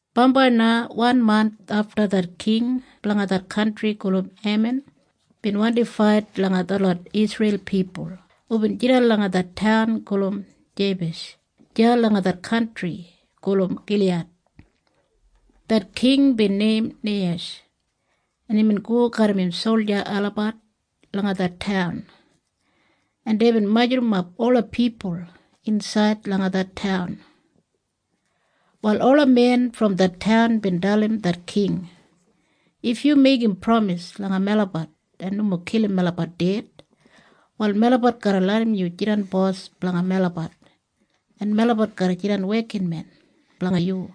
Bambai na wan manth afta det king blanga det kantri gulum Eman bin wandi fait langa detlot Isreil pipul hubin jidan langa det taun gulum Jeibesh deya langa det kantri gulum Giliyad. Det king bin neim Neihesh, en imbin go garram im solja olabat langa det taun, en deibin majurrumap ola pipul insaid langa det taun. Wal ola men brom det taun bin dalim det king, “If yu meigim pramis langa melabat en nomo kilim melabat ded, wal melabat garra larram yu jidan bos blanga melabat, en melabat garra jidan wekinmen blanga yu.”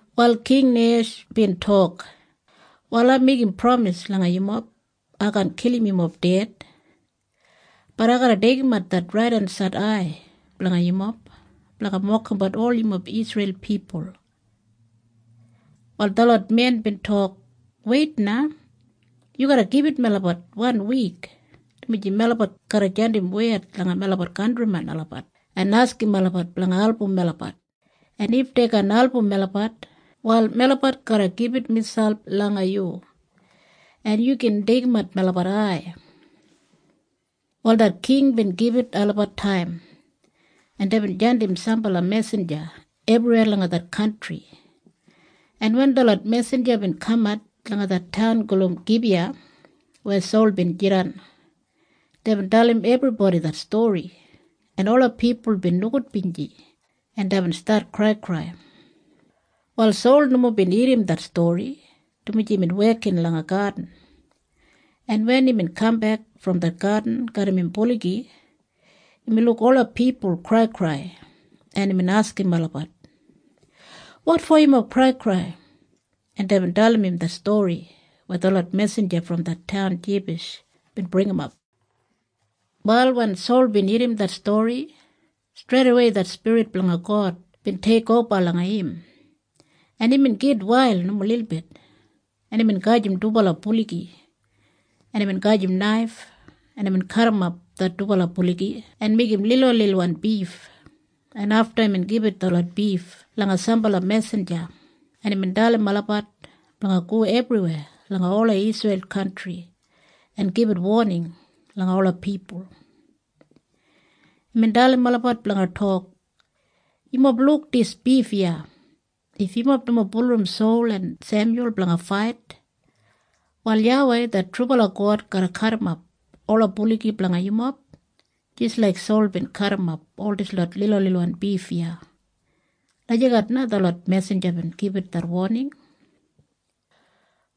Wal King Neihesh bin tok, “Wal ai meigim pramis langa yumob. Ai kaan kilim yumob ded. Bat ai garra deigimat det raidensaid ai blanga yumob blanga mokimbat ol yumob Isreil pipul.” Wal detlot men bin tok, “Weit na. Yu garra gibit melabat wan wik, dumaji melabat garra jandim wed langa melabat kantrimen olabat en askim olabat blanga album melabat, en if dei kaan album melabat, wal melabat garra gibit miselp langa yu, en yu gin deigimat melabat ai.” Wal det king bin gibit olabat taim, en deibin jandim sambala mesinja ebriweya langa det kantri, en wen detlot mesinja bin kamat langa det taun gulum Gibiya weya Sol bin jidan, deibin dalim ebribodi det stori, en ola pipul bin nogudbinji, en deibin stat kraikrai. Wal Sol nomo bin irrim det stori, dumaji imbin wekin langa gadin, en wen imbin kambek brom det gadin garram im buligi, imbin luk ola pipul kraikrai, en imbin askim olabat, “Wotfo yumob kraikrai?” En deibin dalim im det stori weya detlot mesinja brom det taun Jeibesh bin bringimap. Wal wen Sol bin irrim det stori, streidawei det spirit blanga God bin teikoba langa im, en imbin gitwail nomo lilbit, en imbin gajim dubala buligi, en imbin gajim naif, en imbin kadimap det dubala buligi en meigim lilwanlilwan bif, en afta imbin gibit detlot bif langa sambala mesinja, en imbin dalim olabat blanga go ebriweya langa ola Isreil kantri en gibit woning langa ola pipul. Imbin dalim olabat blanga tok, “Yumob luk dis bif iya? If yumob nomo bulurrum Sol en Semyul blanga fait, wal YAWEI det trubala God garra kadimap ola buligi blanga yumob jis laik Sol bin kadimap ol dislot lilwanlilwan bif iya.” Lagijat na detlot mesinja bin gibit det woning.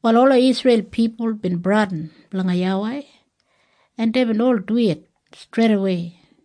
Wal ola Isreil pipul bin bradin blanga YAWEI, en deibin ol duwit streidawei,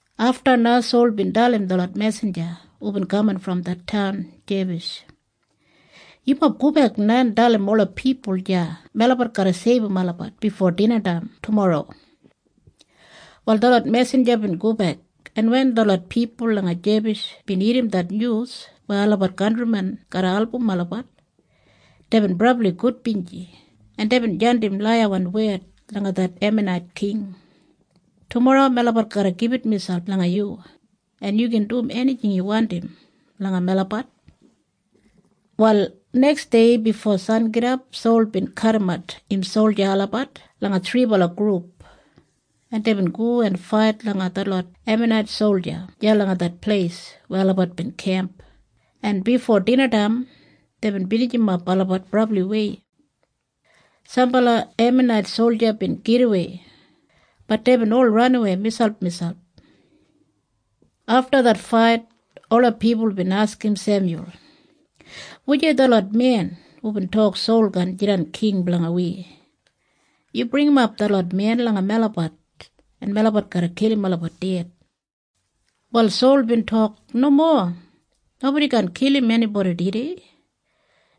Afta na Sol bin dalim detlot mesinja hubin kaman brom det taun Jeibesh, “Yumob gobek na en dalim ola pipul deya melabat garra seibum olabat bifo dinataim tumorro.” Wal detlot mesinja bin gobek, en wen detlot pipul langa Jeibesh bin irrim det nyus weya olabat kantrimen garra album olabat, deibin brabli gudbinji, en deibin jandim laiyawan wed langa det Emanait king, “Tumorro melabat garra gibit miselp langa yu, en yu gin dum enijing yu wandim langa melabat.” Wal neksdei bifo sangidap Sol bin kadimat im solja olabat langa thribala grup, en deibin go en fait langa detlot Emanait solja deya langa det pleis weya olabat bin kemp, en bifo dinataim deibin binijimap olabat brabliwei. Sambala Emanait solja bin gidawei. Bat deibin ol ranawei miselpmiselp. Afta det fait ola pipul bin askim Semyul, “Wujei detlot men hubin tok Sol kaan jidan king blanga wi? Yu bringimap detlot men langa melabat, en melabat garra kilim olabat ded.” Wal Sol bin tok, “Nomo. Nobodi kaan kilim enibodi tudei,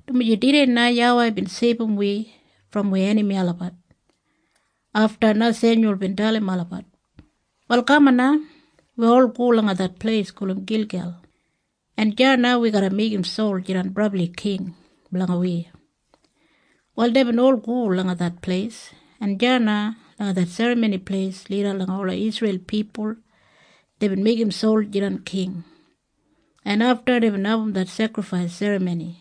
dumaji tudei na YAWEI bin seibum wi brom wi enami olabat.” Afta na Semyul bin dalim olabat, “Wal kaman na. Wi ol go langa det pleis gulum Gilgel, en deya na wi garra meigim Sol jidan brabli king blanga wi.” Wal deibin ol go langa det pleis, en deya na langa det serramoni pleis lida langa ola Isreil pipul deibin meigim Sol jidan king, en afta deibin abum det sekrifais serramoni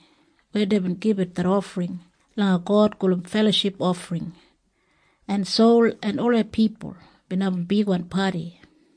weya deibin gibit det ofring langa God gulum feloship ofring, en Sol en ola pipul bin abum bigwan padi.